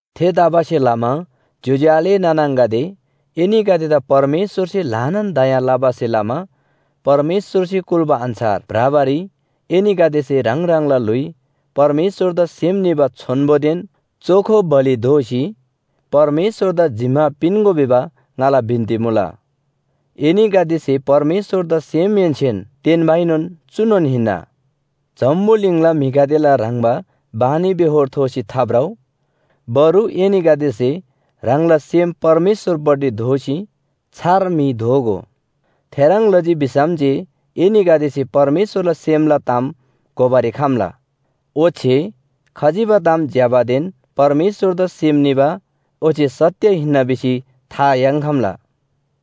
थेतबासेलमा ज्‍योज्‍यो आले नाना आङागदे, एनीगदेदा परमेश्‍वरसे ल्‍हानान दया लबासे लमा परमेश्‍वरसे कुल्‍बा अन्‍छार भ्रबारी एनीगदेसे ह्राङ ह्राङला ल्‍हुइ परमेश्‍वरदा सेम निबा छोन्‍बोदेन चोखो बलि दोसी परमेश्‍वरदा जिम्‍मा पिन्‍गो भिबा ङाला बिन्‍ती मुला। एनीगदेसे परमेश्‍वरदा सेमहेन्‍सेन तेन्‍बाएनोन चुनोन हिन्‍ना। जम्‍बुलिङला म्‍हिगदेला ह्रङ्‌बा बानीबेहोर थोसी थाभ्रउ, बरु एनीगदेसे ह्राङला सेम परमेश्‍वरपट्टि दोःसी छार म्‍हि दोगो। थेह्रङ् लजी भिसम जे एनीगदेसे परमेश्‍वरला सेमला ताम घोबारी खम्‍ला। ओच्‍छे खजिबा ताम ज्‍यबादेन परमेश्‍वरदा सेम निबा ओच्‍छे सत्‍य हिन्‍ना भिसी था याङ्‌खम्‍ला।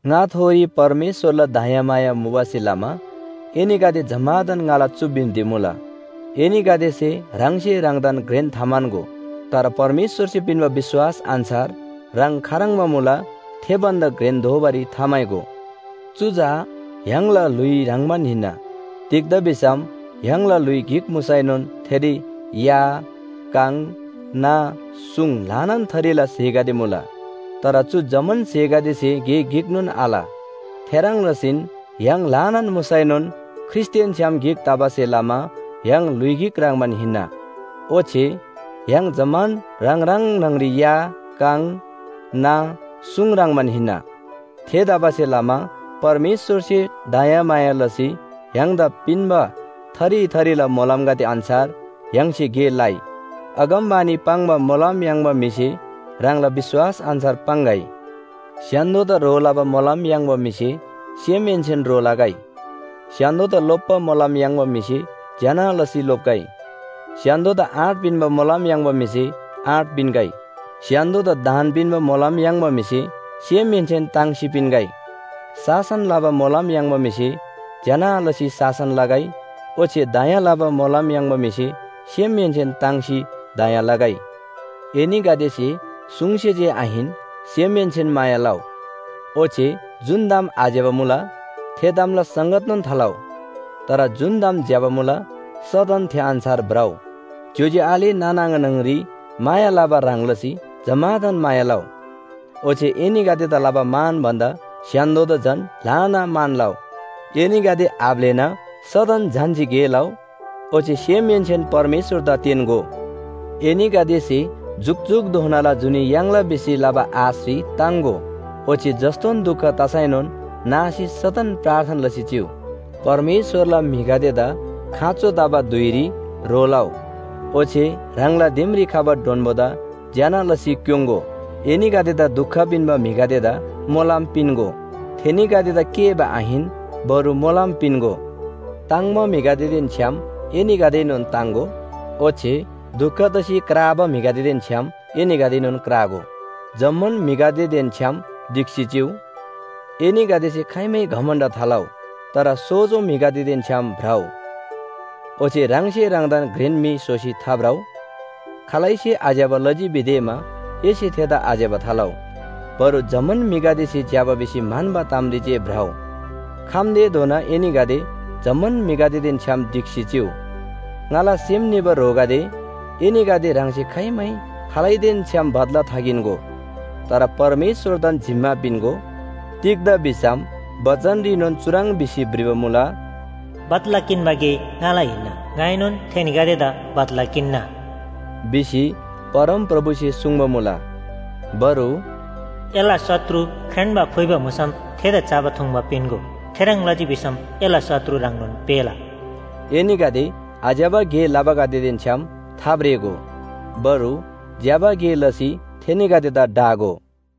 ङाथोरी परमेश्‍वरला दयामाया मुबासे लमा एनीगदे जम्‍मादान ङाला चु बिन्‍ती मुला, एनीगदेसे ह्राङसे ह्राङदान घ्रेन थाम्‍हन्‍गो। तर परमेश्‍वरसे पिन्‍बा विश्‍वास अन्‍छार ह्राङ खाह्रङ्बा मुला थे भन्‍दा घ्रेन दोबारी थाम्‍हाइगो। चु चा य्‍हाङला ल्‍हुइ ह्रङ्‌बान हिन्‍ना। तिग्‍दा भिसम य्‍हाङला ल्‍हुइ गिक मुसैनोन थेरी या, काङ, ना, सुङ ल्‍हानान थरीला स्‍हेगदे मुला। तर चु जम्‍मान स्‍हेगदेसे गे गिकनोन आल। थेह्रङ् लसीन य्‍हाङ ल्‍हानान मुसैनोन ख्रीष्‍टदेन छ्‌याम गिक तबासे लमा य्‍हाङ ल्‍हुइ गिक ह्रङ्‌बान हिन्‍ना, ओच्‍छे य्‍हाङ जम्‍मान ह्राङ ह्राङ न्‍हङरी या, काङ, ना, सुङ ह्रङ्‌बान हिन्‍ना। थेतबासेलमा परमेश्‍वरसे दयामाया लसी य्‍हाङदा पिन्‍बा थरी थरीला मोलमगदे अन्‍छार य्‍हाङसे गे लइ। अगमवाणी पाङ्बा मोलम याङ्बा म्‍हिसे ह्राङला विश्‍वास अन्‍छार पाङ्‌गै, स्‍य्‍हान्‍दोदा ह्रो लबा मोलम याङ्बा म्‍हिसे सेमहेन्‍सेन ह्रो लगै, स्‍य्‍हान्‍दोदा लोप्‍बा मोलम याङ्बा म्‍हिसे ज्‍यना लसी लोप्‍गै, स्‍य्‍हान्‍दोदा आँट पिन्‍बा मोलम याङ्बा म्‍हिसे आँट पिन्‍गै, स्‍य्‍हान्‍दोदा दान पिन्‍बा मोलम याङ्बा म्‍हिसे सेमहेन्‍सेन ताङ्सी पिन्‍गै, शासन लबा मोलम याङ्बा म्‍हिसे ज्‍यना लसी शासन लगै ओच्‍छे दया लबा मोलम याङ्बा म्‍हिसे सेमहेन्‍सेन ताङ्सी दया लगै। एनीगदेसे सुङसे जे आहिन सेमहेन्‍सेन माया लउ। ओच्‍छे जुन ताम आज्‍यबा मुला थे तामला संगतनोन थालउ। तर जुन ताम ज्‍यबा मुला सदन थे अन्‍छार भ्रउ। ज्‍योज्‍यो आले नाना आङा न्‍हङरी माया लबा ह्रङ् लसी जम्‍मादान माया लउ। ओच्‍छे एनीगदेदा लबा मान भन्‍दा स्‍य्‍हान्‍दोदा झन ल्‍हाना मान लउ। एनीगदे आब्‍लेना सदन झन्‍सी गे लउ, ओच्‍छे सेमहेन्‍सेन परमेश्‍वरदा तेन्‍गो। एनीगदेसे जुकजुकधोनाला जुनी याङ्ला भिसी लबा आशरी ताङ्‍गो, ओच्‍छे जस्‍तोन दुख तसैनोन नासी सदन प्रार्थना लसी चिउ। परमेश्‍वरला म्‍हिगदेदा खाँचो तबा धुइरी ह्रो लउ, ओच्‍छे ह्राङला दिमरी खबा डोन्‍बोदा ज्‍यना लसी क्‍योङ्‍गो। एनीगदेदा दुख पिन्‍बा म्‍हिगदेदा मोलम पिन्‍गो। थेनीगदेदा केःबा आहिन, बरु मोलम पिन्‍गो। ताङ्‍बा म्‍हिगदेदेन छ्‌याम एनीगदेएनोन ताङ्‍गो, ओच्‍छे दुख तसी क्राबा म्‍हिगदेदेन छ्‌याम एनीगदेएनोन क्रागो। जम्‍मान म्‍हिगदेदेन छ्‌याम ढिक्‍सी चिउ। एनीगदेसे खाइमै घमण्‍ड थालउ, तर सोजो म्‍हिगदेदेन छ्‌याम भ्रउ। ओच्‍छे ह्राङसे ह्राङदान घ्रेन म्‍हि स्‍होसी थाभ्रउ। खालैसे आज्‍यबा लजी भिदेमा एसे थेदा आज्‍यबा थालउ। बरु जम्‍मान म्‍हिगदेसे ज्‍यबा भिसी म्‍हन्‍बा तामरी जे भ्रउ। खम्‍तेधोना एनीगदे जम्‍मान म्‍हिगदेदेन छ्‌याम ढिक्‍सी चिउ। ङाला सेम निबा ह्रोगदे, एनीगदे ह्राङसे खाइमै खालैदेन छ्‍याम बदला थाकिन्‍गो, तर परमेश्‍वरदान जिम्‍मा पिन्‍गो। तिग्‍दा भिसम बचनरीनोन चुह्रङ् भिसी भ्रिबा मुला, “बदला किन्‍बा गे ङाला हिन्‍ना, ङाइनोन थेनीगदेदा बदला किन्‍ना” भिसी परमप्रभुसे सुङ्बा मुला। बरु, “एला शत्रु ख्रेन्‍बा फुइबा मुसम थेदा चबा थुङ्बा पिन्‍गो थेह्रङ् लजी भिसम एला शत्रु ह्राङनोन पेःला।” एनीगदे आज्‍यबा गे लबागदेदेन छ्‌याम थाब्रेगो, बरु ज्‍यबा गे लसी थेनीगदेदा ढागो।